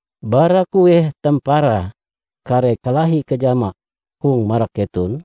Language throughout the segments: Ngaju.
Bara kueh tamparae kare kalahi kajama hong marak keton?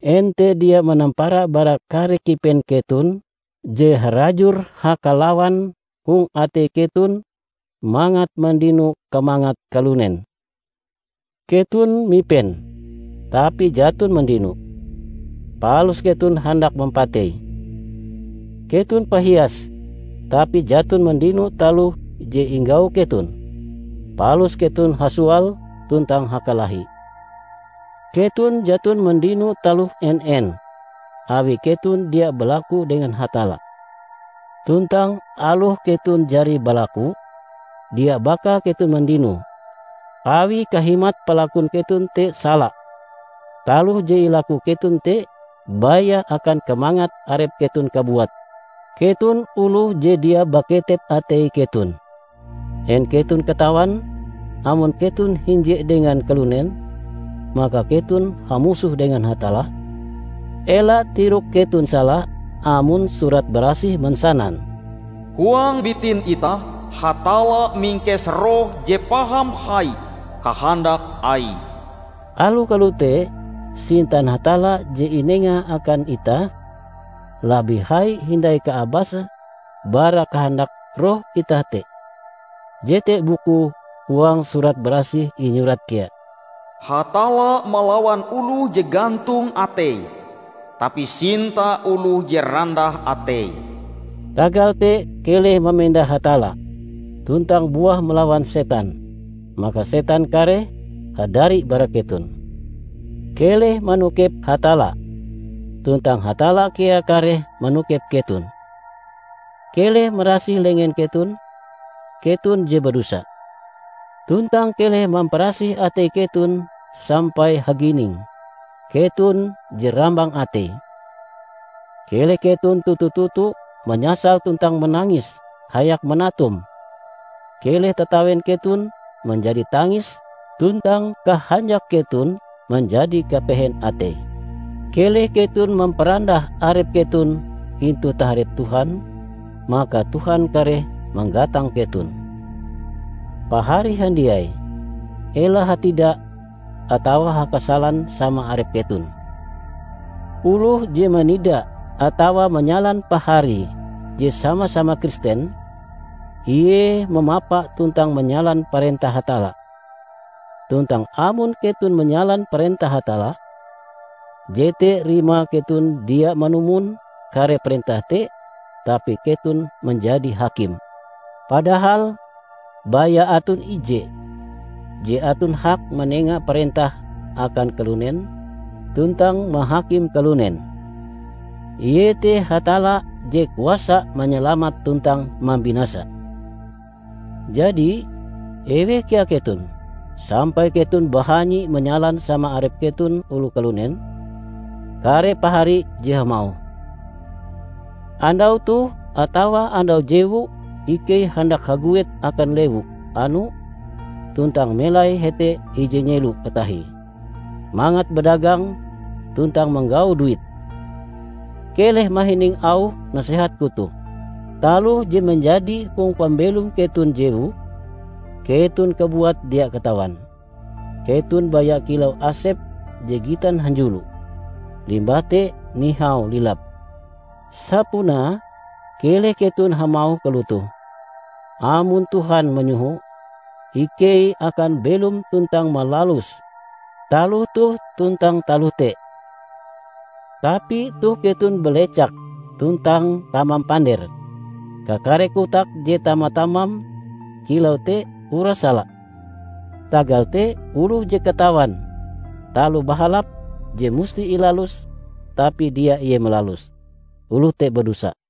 En te dia manampara bara kare kipen keton je harajur hakalawan hong atei keton mangat mandino kamangat kalunen! Keton mipen, tapi jaton mandino, palus keton handak mampatei! Keton pahias, tapi jaton mandino taloh je inggau keton, palus keton hasoal tuntang hakalahi. Keton jaton mandino taloh en-en, awi keton dia balaku dengan Hatalla. Tuntang aloh keton jari balakue, dia baka keton mandinoe, awi kahimat palakun keton te sala; taloh je ilaku keton te baya akan kamangat arep keton kabuat. Keton oloh je dia baketep atei keton! En keton katawan amon keton hinje dengan kalunen, maka keton hamusoh dengan Hatalla? Ela tirok keton sala amon Surat Barasih mansanan, "Huang bitin itah Hatalla mingkes Roh je paham hai kahandak Aie." Aloh kalote, sintan Hatalla je inengae akan itah labih hai hindai kaabase bara kahandak roh itah te. Jete bukue huang Surat Barasih inyurat kea, "Hatalla malawan oloh je gantong ateie, tapi sinta oloh je randah ateie." Tagal te keleh mamenda Hatalla, tuntang buah malawan setan, maka setan kareh hadari bara keton. Keleh manokep Hatalla, tuntang Hatalla kea kareh manokep keton. Keleh marasih lengen keton, keton je badosa! Tuntang keleh mamparasih atei keton sampai hagining, keton je rambang ateie! Keleh keton toto-toto manyasal tuntang manangis hayak manatum; keleh tatawen keton manjadi tangis tuntang kahanjak keton manjadi kapehen atei! Keleh keton mamparandah arep keton intu taharep Tuhan, maka Tuhan kareh manggatang keton. Pahari handiai, ela hatida atawa hakasalan sama arep keton. Oloh je manida atawa manyalan paharie je sama-sama Kristen, ie mamapa tuntang manyalan parentah Hatalla. Tuntang amon keton manyalan parentah Hatalla, jete rimae keton dia manumon kare parentah te, tapi keton manjadi hakim. Padahal baya aton ije je aton hak manenga parentah akan kalunen tuntang mahakim kalunen. Ie te Hatalla je kuasa manyalamat tuntang mambinasa. Jadi, eweh kea keton, sampai keton bahanyi manyalan sama arep keton oloh kalunen? Kare Pahari je hamauh, "Andau toh atawa andau jewu ikei handak haguet akan lewu anu tuntang melai hete ije nyelo katahie mangat badagang tuntang manggau duit," -- keleh mahining auh nasehatku toh. Taloh je manjadi hong pambelom keton jewu, keton kabuat dia katawan! Keton baya kilau asep je gitan hanjulo, limbah te nihau lilap. Sapunae keleh keton hamauh kalotoh, "Amon Tuhan manyoho, ikei akan belom tuntang malalus taloh toh tuntang taloh te." Tapi toh keton balecak tuntang tamam pander. Kakare kotak je tama-tamam kilau te uras sala. Tagal te, oloh je katawan taloh bahalap je musti ilaluse tapi dia ie malaluse, oloh te badosa.